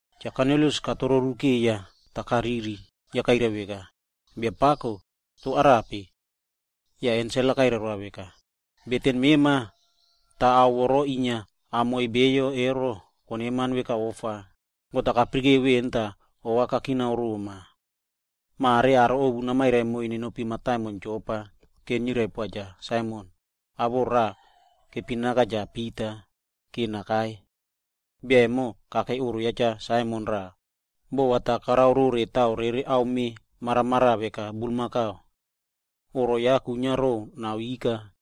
Cha Kornilius ine katrorukeiya yah kariri, yah kairai veka, “Biapako, toh arape?” Yah ensel-a kairai roa veka, “Beten mema, yah ao voro inia kamiꞌiy beyo ero koneman veka ofa, God-a kayara veꞌen tah ova kakina roma. Mare va namairai moiy aro ovu nenopi mataimon Jopa vora nirai poa Cha Saimon, awoꞌo ya raꞌa kepinaka veka Cha Pita va nakai. Bia vemona kakei oꞌro ya Cha Saimon raꞌa, boꞌo karao rore ame maramaraꞌa taꞌa veka bulmakau. Oꞌro ya kwinia ro nao ika.”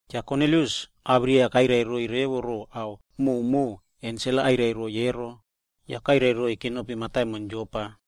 Cha Kornilius awirai-a kairai roiy revo ro ao vemona ensel-a kairai roa emo, yake kairai roiy keparo mataimon Jopa.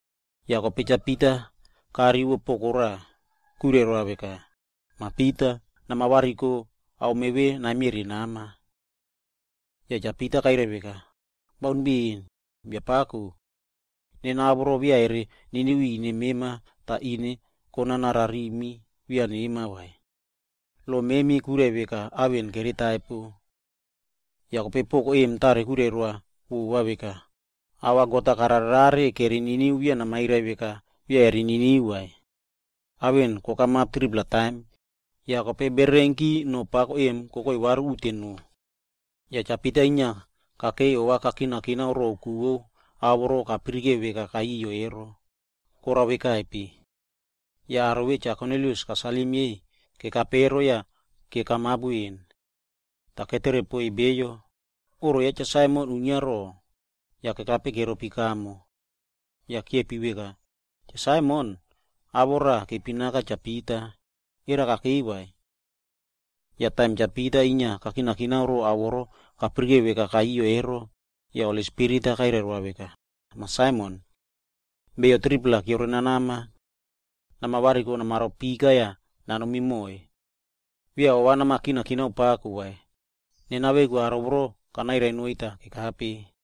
Yah kope Cha Pita karivo poko raꞌa kwirai roa veka, “Mah Pita! Nama variko, ame vemona namiere yah nama.” Yah Cha Pita kairai veka, “Baun poaka, Biapako. Nena ao voro beya koniniu ri ine mema kana vai, tah ine konana rarimi beya kuiniari nema vai. Lo memi kwirai veka ao vemona kere taipere.” Yah kope poko vemona kwirai roa vova veka, “Ao vemo God-a karare rare kere niniu, beya namairai veka kere taipo vai.” Ao vemona kokamap 3-pla taim, yah kope bererenki aimino pako vemona kokoi varu uteno. Yah Cha Pita kakei yah inia ova kakinakina ro ku vo ao vemona kapirikeu veka ao yoyo ero, korao veka rope. Yah kope aro vemona Cha Kornilius kasalim yei kekape emo, yake kekape veni. Yah ketere poiy bio ro oꞌro ya Cha Saimon kwinia rope, yah kekape keropi kamo. Yah kope kiepi veka, “Cha Saimon, awoꞌo ya raꞌa kepinaka veka Cha Pita, era kakei vai?” Yah taim Cha Pita inia ova kakinakina ro ao vemo kapirikeu veka ao yoyo ve, yah kope Holi Spirit-a kwirai roa veka, “Mah Saimon! Beyo 3-pla keore nanama. Nama variko namaro pika yah nanomi moiy. Beya ova nama kinakina pako vai, aro vemona nena veku kanairai noiy tah kekape.”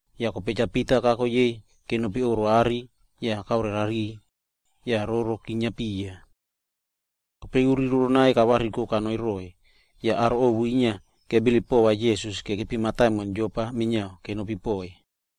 Yah kope Cha Pita kako yei kenopi oꞌro are tah kaore rariy, yah roro chinia piya. Kope uri roronai kavariko yah kanoi roꞌoiy, yah aro ovu kesave kebilip pova Jisas kekepi mataimon Jopa minia kenopi poꞌoiy.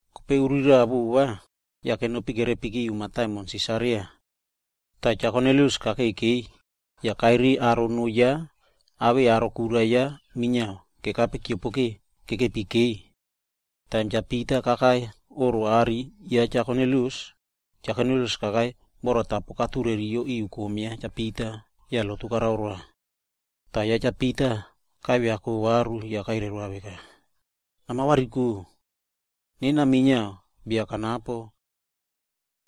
Kope umo raꞌa vova kiute kenopi yah kerepiki mataimon Sisaria. Cha Kornilius kakei kekeiy yah kairiy aro noo ya awei aro kura ya minia kekape tah keopokeu kekeiy. Yah taim Cha Pita kakai oꞌro are ya Cha Kornilius, kope Cha Kornilius kakai yah oku katureriki ri kom ya Cha Pita yah lotu karao roa. Toh kope Cha Pita karaipakako varu yah kairai roa veka, “Nama variko! Nena minia bia kanapo.”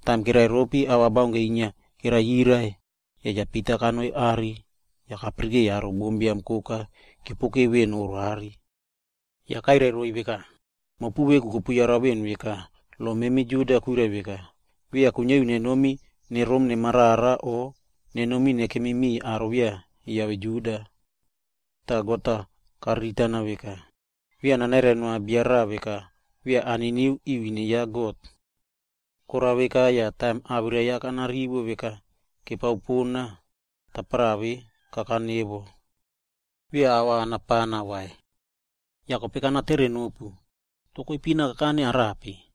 Taim kereropi ava baunke inia kereyirai, yah kope Cha Pita kanoi are tah kapirikeiy aro bombiam koka keopokeu veꞌen oꞌro are. Yah kairai roiy veka, “Mopu veku kopu yara veꞌen veka lo memi Juda kwirai veka, memi beya kuiniari nenomi nerom nemarara o nenomi nekem miꞌiy aro beya kiave Juda vai. Toh God-a kariritana veka, beya nanairai noa bia raꞌa veka beya kaniniu ri ine ya God vai. Korao veka tah taim awirai mopu kanako veka kopere pona, tapara ve kakane ke. Beya ava kana pana vai. Yah kope kana tere nopu, toh koipina kakane no arape?”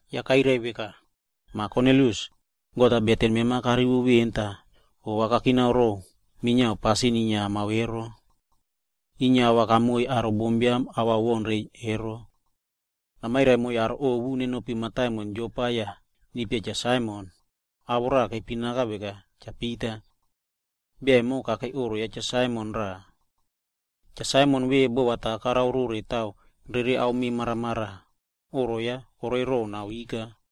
Yah kope kairai veka, ‘Mah Kornilius, God-a beten mema karivo veni tah ova kakina ro minia pasin inia kamao ero. Mema inia ava kama vani konoi roiy aro bombiam ava kere baun reiy. Namairai moiy aro ovu nenopi Jopa yah niypia Cha Saimon, awoꞌo ya raꞌa kepinaka veka Cha Pita. Bia vemona kakei oꞌro ya Cha Saimon raꞌa. Cha Saimon vemo boꞌo vo ame taꞌa maramaraꞌa karao, oꞌro ya kwinia ro nao ika.’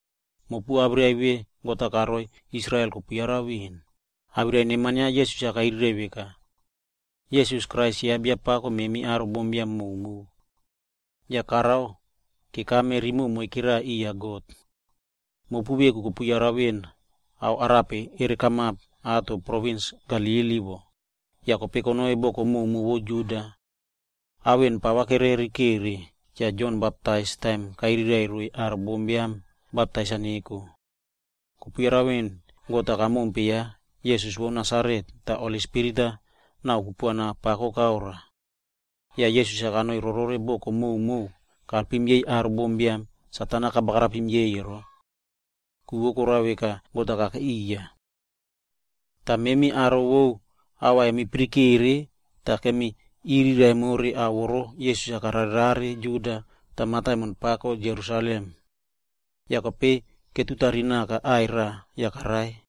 Mopu awirai vemona God-a karoi aro vo Israel kopu yara veꞌen, awirai neman ya Jisas-a kairiraiꞌvo veka, Jisas Krais ya Biapako memi aro bombiam koka. Yah karao kekame romoꞌo moikera riya God. Mopu veku kopu yara veꞌen arape kokamap provins Galili titja wo, yah kope konoi boko koka vo Juda. Ao vemona pava kererekeiya Cha Jon Baptais taim kairai roiy aro bombiam-a va baptais-a neko. Mopu kopu yara veꞌen God-a kamakim ya Jisas vo Nasaret, yah Holi Spirit re kupuana pako karoa. Yah Jisas-a kanoi rorore boko maomao yah kalpim yei aro bombiam Satan-a karao ketaipei ero. Ku vo korao veka God-a kakei riya. “Yah memi aro vo ava kemi pirikere yah kemirai more ao vemona Jisas-a karare rare Juda re mataimon pako Jerusalem. Yah kope ketutari naka aꞌai raꞌa yah karai.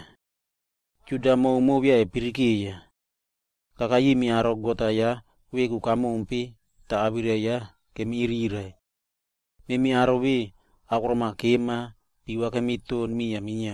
Aro Juda koka beya kepirikeiya vai. Kakai rimi aro memi God-a kamompe pon, yah awirai ya kemiriraiꞌvo. Memi aro vemona, akorom-a kema yah piva kemiton miya minia.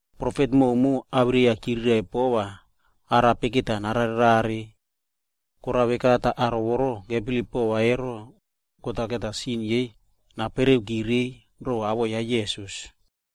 Profet prumo awirai-a ya chiriraiꞌvo rore arape va narare rare. Korao veka tah aro voro kebilip pova ero, va God-a sin yei napereuki reiy ro awoꞌo ya Jisas.”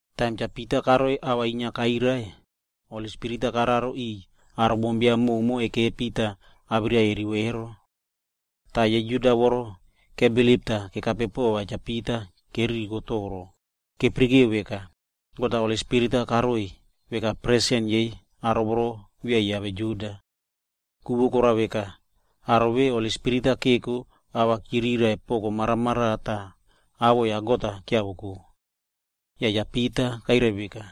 Taim Cha Pita karoi yah inia ava kairai, kope Holi Spirit-a korarotai aro maomao vemona kekepi yah awirai-a inia kerivo emo. Aro Juda voro kebilip tah kekape pova Cha Pita emo keririkope toro, keyara veka, God-a Holi Spirit-a karoiy veka presen yei aro voro beya kiave Juda ero. Ku vo korao veka, aro vemona Holi Spirit-a keko emo ava chirai poko maramaraꞌa yah awoꞌo ya God-a kiavoko nake. Yah kope Cha Pita kairai veka,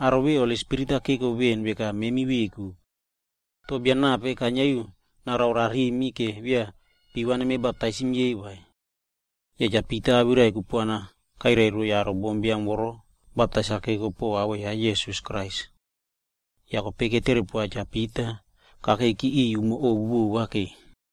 “Aro vemona Holi Spirit-a keko veꞌen veka memi veku. Toh bia nape kainiari narao rarimi vora beya piva nemi baptaisim yei vai?” Yah Cha Pita awirai kupuana kairai roiy aro bombiam vemona va baptais-a neko po awoꞌo ya Jisas Krais. Yah kope ketere poa Cha Pita va nakeiki riꞌiy umo ovu vova ke.